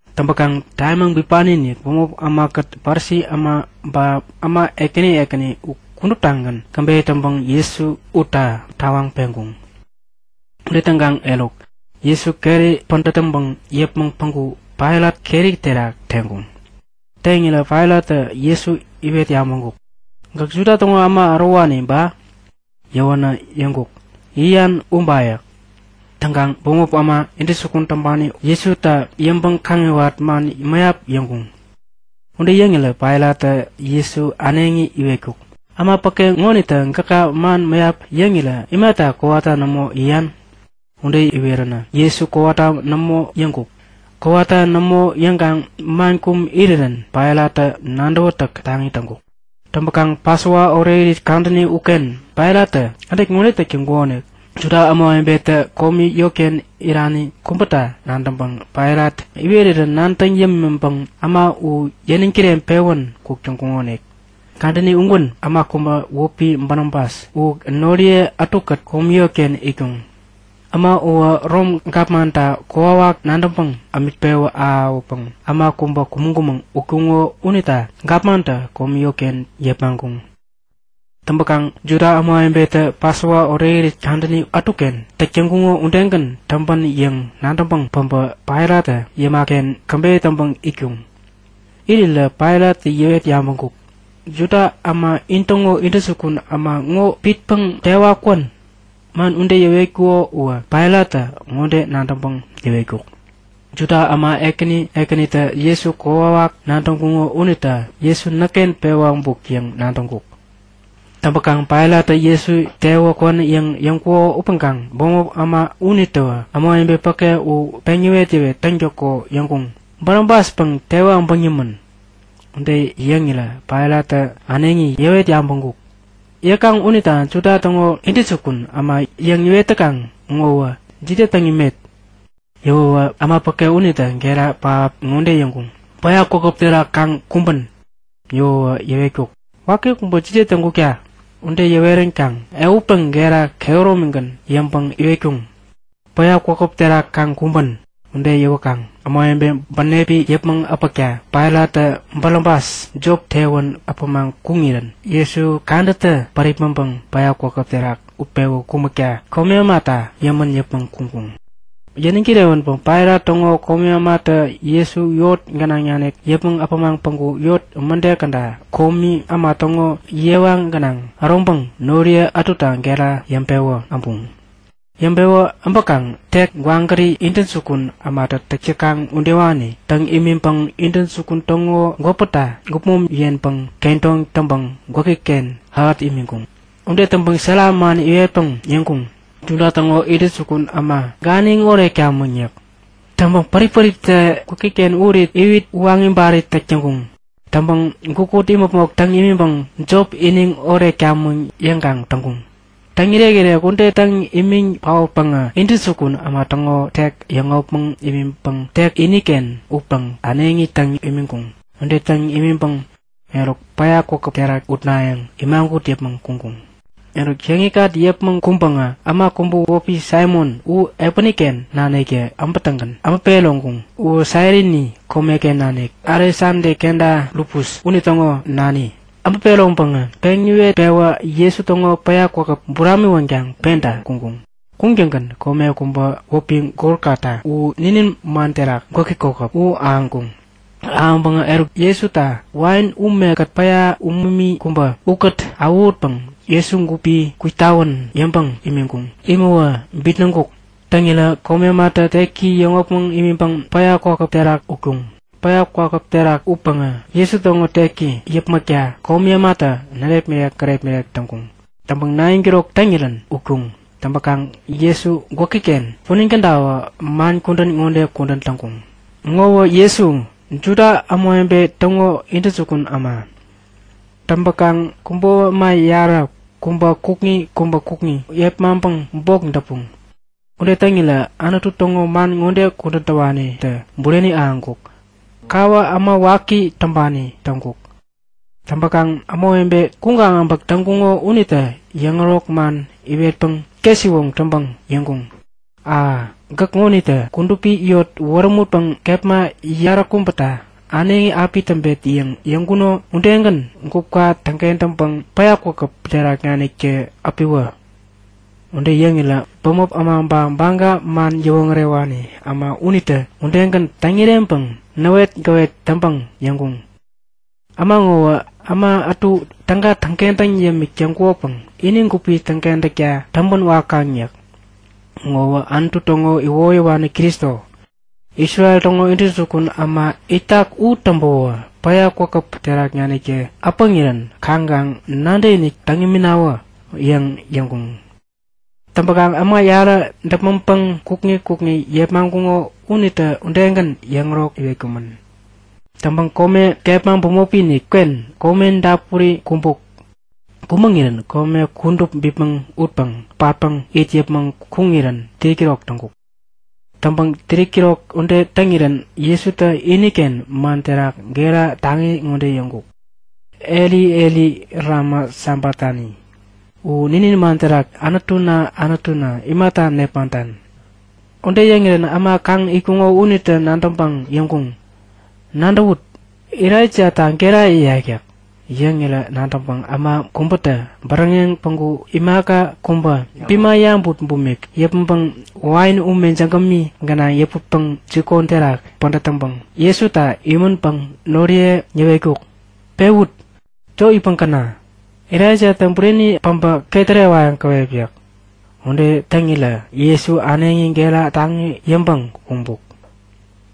Täŋpäŋ tamimaŋ bipaniinik bämop ämakät Parisi äma ba äma ekäni ekäni u kuduptagän käbeyä täŋpäŋ Jesu utta tawaŋ peŋkuŋ. Ude täŋkaŋ eruk, Jesu keri pädät täŋpäŋ yäpmäŋ päŋku Pailat keri terak teŋkuŋ. Teŋirä Pailattä Jesu iwet yabäŋkuk; Gäk Juda täŋo äma ärowani ba? Yäwänä yäŋkuk; Yäyan uba yäk. Täŋkaŋ bämop äma intäjukun täŋpani Jesuta yäŋpäŋ-kaŋiwat man mäyap yäŋkuŋ. Ude yäŋirä Pailattä Jesu äneŋi iwetkuk; Äma päke ŋonitä gäka man mäyap yäŋirä imata kowata nämo yäyan? Ude iweränä Jesu kowata nämo yäŋkuk. Kowata nämo yäŋkaŋ man kum irirän Pailattä nadäwätäk taŋi täŋkuk. Täŋpäkaŋ Pasova Orekirit Kadäni udeken Pailattä kädet ŋode täk täŋkukonik; Juda ämawebetä komi yotken irani kubäta nadäŋpäŋ Pailat iwerirä nadäŋ yämiŋpäŋ äma u yäniŋ kireŋpewän kuk täŋkuŋonik. Kadäni ugän äma kubä wäpi Barabas u noriye ätukät komi yotken itkuŋ. Äma uwä Rom gapmanta kokwawak nadäŋpäŋ ämik pewä ahäwäpäŋ äma kubä kumäŋ-kumäŋ utkuŋo unita gapmantä komi yotken yepmaŋkuŋ. Täŋpäkaŋ Juda ämawebetä Pasova Orekirit Kadäni ätuken täk täŋkuko udegän täŋpän yäŋ nadäŋpäŋ päbä Pailattä yäma-ken käbeyä täŋpäŋ itkuŋ. Irirä Pailattä yäwet yabäŋkuk; Juda äma intäŋo intäjukun äma ŋo pitpäŋ tewa kwän? (Man ude yäwetkuko uwä Pailattä ŋode nadäŋpäŋ yäwetkuk; Juda äma ekäni ekänitä Jesuta kokwawak nadäŋkuŋo unita Jesu näkken pewä äbuk yäŋ nadäŋkuk.) Täŋpäkaŋ Pailattä Jesu tewa kwän yäŋ yäŋkuko upäŋkaŋ bämop äma unitäwä ämawebe päke u peŋ yäwet-yäwet täŋtäko yäŋkuŋ; Barabaspäŋ tewi äbäŋ nimän! Ude yäŋirä Pailattä äneŋi yäwet yabäŋkuk; Yäkaŋ unita Juda täŋo Intäjukun Äma yäŋ iwet täkaŋ ŋowä jide täŋ imet? Yäwänä äma päke unitä gera pähap ŋode yäŋkuŋ; Päya kwakäp terak kaŋ kumbän! Yäwäwä yäwetkuk; Waki kubä jide täŋkukta? Ude yäweränkaŋ ehutpäŋ gera kehäromigän yäŋpäŋ iwetkuŋ; Päya kwakäp terak kaŋ kumbän! Ude yäwäkaŋ ämawebe bänepi yäpmäŋ äpäkta Pailattä Barabas jop tewän äpämaŋ kuŋirän Jesu kadätä päripmäŋpäŋ päya kwakäp terak utpewä kumäkta komi ämata yämän yäpmäŋ kuŋkuŋ. Yäniŋ kirewänpäŋ Pailat täŋo komi ämatä Jesu yot gänaŋ nanik yäpmäŋ äpämaŋ päŋku yot mäde käda komi äma täŋo yewa gänaŋ äroŋpäŋ noriye ätuta gera yäŋpewä äbuŋ. Yäŋpewä äbäkaŋ tek gwagäri intäjukun ämatä täk täkaŋ udewani täŋ imiŋpäŋä intäjukun täŋo gwäpäta gupmom yenpäŋ kedoŋ täŋpäŋ gwäki-ken ähät imiŋkuŋ. Ude täŋpäŋ sära man iwetpäŋ yäŋkuŋ; Juda täŋo intäjukun äma, ganiŋ oretkamäŋ! yäk. Täŋpäŋ pärip-päriptä gwäki-ken urit iwit uwaŋ ibarit täk täŋkuŋ. Täŋpäŋ gukut imäpmok täŋ imiŋpäŋ jop iniŋ oretkamäŋ yäŋkaŋ täŋkuŋ. Täŋirek-irek ude täŋ imiŋ paotpäŋä intäjukun äma täŋo tek yäŋopmäŋ imiŋpäŋ tek iniken upäŋ äneŋi täŋ imiŋkuŋ. Ude täŋ imiŋpäŋ, eruk päya kwakäp terak utnayäŋ imagut yäpmäŋ kuŋkuŋ. Eruk, yäŋikŋat yäpmäŋ kuŋpäŋä äma kubä wäpi Saimon u epäniken naniktä äbätäŋgän äbä peroŋkuŋ. Uwä Sairini komeken nanik, Aleksada kenta Rufus unitäŋo nani. Äbä peroŋpäŋä peŋ iwet-pewä Jesu täŋo päya kwakäp buramiwänkaŋ penta kuŋkuŋ. Kuŋtäŋgän kome kubä wäpi Golgota, u ninin man terak gwäki kokäp, u ahäŋkuŋ. Ahäŋpäŋä eruk Jesuta wain umekät päya umumi kubä ukät awähutpäŋ Jesu gupi kwitawän yäŋpäŋ imiŋkuŋ. Imäwä bitnäŋkuk. Täŋirä komi ämatä teki yäŋopmäŋ imiŋpäŋ päya kwakäp terak utkuŋ. Päya kwakäp terak utpäŋä Jesu täŋo teki yäpmäkta komi ämatä närepmirek gärepmirek täŋkuŋ. Täŋpäŋ 9'kirok täŋirän utkuŋ. Täŋpäkaŋ Jesu gwäki-ken punin käda man kudän ŋode kudän täŋkuŋ; Ŋowä Jesu, Juda Ämawebe Täŋo Intäjukun Äma. Täŋpäkaŋ kubo äma yarä, kubä kukŋi kubä kukŋi yepmaŋpäŋ bok däpuŋ. [ Ude täŋirä Anutu täŋo man ŋode kudän täwanitä bureni ahäŋkuk; Kawä äma waki täŋpani täŋkuk.] Täŋpäkaŋ ämawebe kuŋkaŋ äbäk täŋkuŋo unitä yäŋärok man iwetpäŋ ketsiwoŋ täŋpäŋ yäŋkuŋ; A! Gäk ŋonitä kudupi yot wärämutpäŋ kepma yaräkubäta äneŋi api täŋpet yäŋ yäŋkuno udegän gupka täŋkentäŋpäŋ päya kwakäp terak naniktä äpiwä! Ude yäŋirä bämop äma ba Baga man yäwoŋärewani äma unitä udegän täŋ-ireŋpäŋ näwetgäwet täŋpäŋ yäŋkuŋ; Äma ŋowä äma ätu täga täŋkentäŋ yämik täŋkukopäŋ ini gupi täŋkentäkta täŋpän wakaŋ yäk. Ŋowä Anutu täŋo iwoyäwani Kristo, Isrel täŋo Intäjukun Äma itak u täŋpäwä päya kwakäp terak naniktä äpäŋirän kaŋkaŋ nadäkinik täŋ iminawä! yäŋ yäŋkuŋ. Täŋpäkaŋ äma yarä däpmäŋpäŋ kukŋi kukŋi yepmaŋkuŋo unitä udegän yäŋärok iwetkumän. Täŋpäŋ kome kepma bämopi-inik uken kome dapuri kumbuk. Kumäŋirän kome kudup bipmäŋ utpäŋ patpäŋ it yäpmäŋ kuŋirän 3'kirok täŋkuk. Täŋpäŋ 3'kirok ude täŋirän Jesutä iniken man terak gera taŋi ŋode yäŋkuk; Elai, Elai, lema sabaktani? U ninin man terak Anutuna, Anutuna imata nepmaŋtan? Ude yäŋirän äma kaŋ itkuŋo unitä nadäŋpäŋ yäŋkuŋ; Nadäwut! Elaijata gera yäyak yäk. Yäŋirän nadäŋpäŋ äma kubätä bäräŋeŋ päŋku imaka kubä bima yabut bumik yäpmäŋpäŋ wain ume jägämi gänaŋ yäputpäŋ jikon terak pädät täŋpäŋ Jesuta imiŋpäŋ noriye yäwetkuk; Pewut! Jop itpäŋ käna. Elaijatä bureni päbä ketärewayäŋ käwep yäk. Ude täŋirä Jesu äneŋi gera taŋi yäŋpäŋ kumbuk.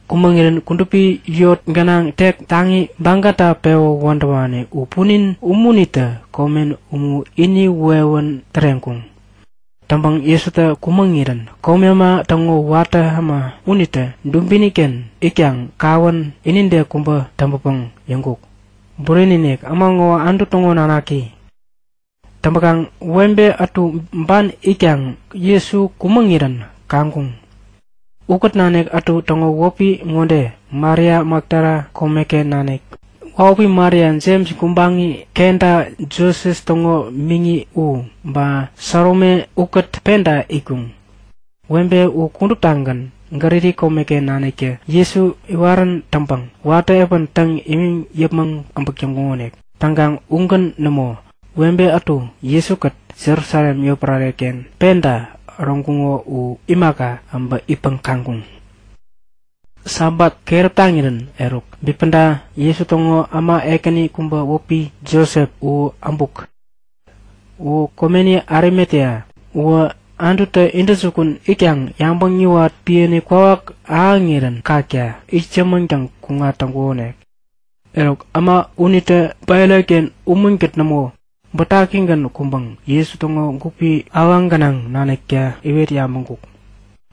Kumäŋirän kudupi yot gänaŋ tek taŋi bagata pewä wädäwani u punin ununitä komen umu ini wewän täreŋkuŋ. Täŋpäŋ Jesutä kumäŋirän komi äma täŋo watä äma unitä dubini-ken itkaŋ kawän inide kubä täŋpäpäŋ yäŋkuk; Bureni-inik, äma ŋowä Anutu täŋo Nanaki! Täŋpäkaŋ webe ätu ban itkaŋ Jesu kumäŋirän kaŋkuŋ. Ukät nanik ätu täŋo wäpi ŋode; Maria Makdala komeken nanik, wahupi Maria, Jems gubaŋi kenta Joses täŋo miŋi u, ba Salome ukät penta itkuŋ. Webe u kuduptagän Galili komeken naniktä Jesu iwarän täŋpäŋ watä epän täŋ imiŋ yäpmäŋ äbäk täŋkuŋonik. Täŋkaŋ ugän nämo, webe ätu Jesu-kät Jerusalem yotpärare-ken penta äroŋkuŋo u imaka, äbä itpäŋ kaŋkuŋ. Sabat keräp taŋirän eruk bipäda Juda täŋo äma ekäni kubä wäpi Josep u äbuk. U komeni Arimatea. Uwä Anututä intäjukun itkaŋ yabäŋ yäwat piäni kwawak ahäŋirän kakta itsämäŋtäŋ kuŋat täŋkukonik. Eruk, äma unitä Pailat-ken umunkät nämo, bätakigän kuŋpäŋ Jesu täŋo gupi awaŋ gänaŋ änekta iwet yabäŋkuk.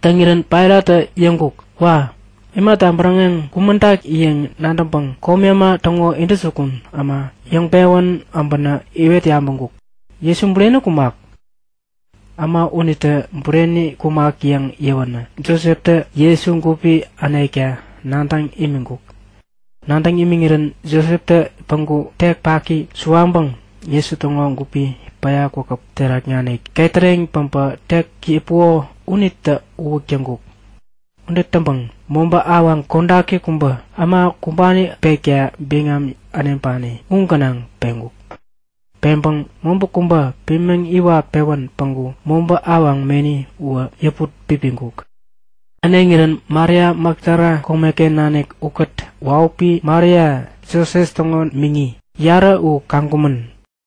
Täŋirän Pailattä yäŋkuk; Wa! Imata bäräŋeŋ kumäŋtak yäŋ nadäŋpäŋ komi äma täŋo intäjukun äma yäŋpewän äbänä iwet yabäŋkuk; Jesu bureni kumak? Äma unitä bureni kumak yäŋ yäwänä Joseptä Jesu gupi änekta nadäŋ imiŋkuk. Nadäŋ imiŋirän Joseptä päŋku tek paki suwaŋpäŋ, Jesu täŋo gupi päya kwakäp terak nanik ketäreŋ päpä tek yäpuko unitä uwäk täŋkuk. Ude täŋpäŋ mobä awaŋ kodaki kubä äma kumbani pekta biŋam äneŋpani u gänaŋ peŋkuk. Peŋpäŋä mobä kubä pimiŋ iwat-pewän päŋku mobä awaŋ meni uwä yäput pipiŋkuk. Äneŋirän Maria Makdala komeken nanik ukät wahupi Maria Joses täŋo miŋi, yarä u kaŋkumän.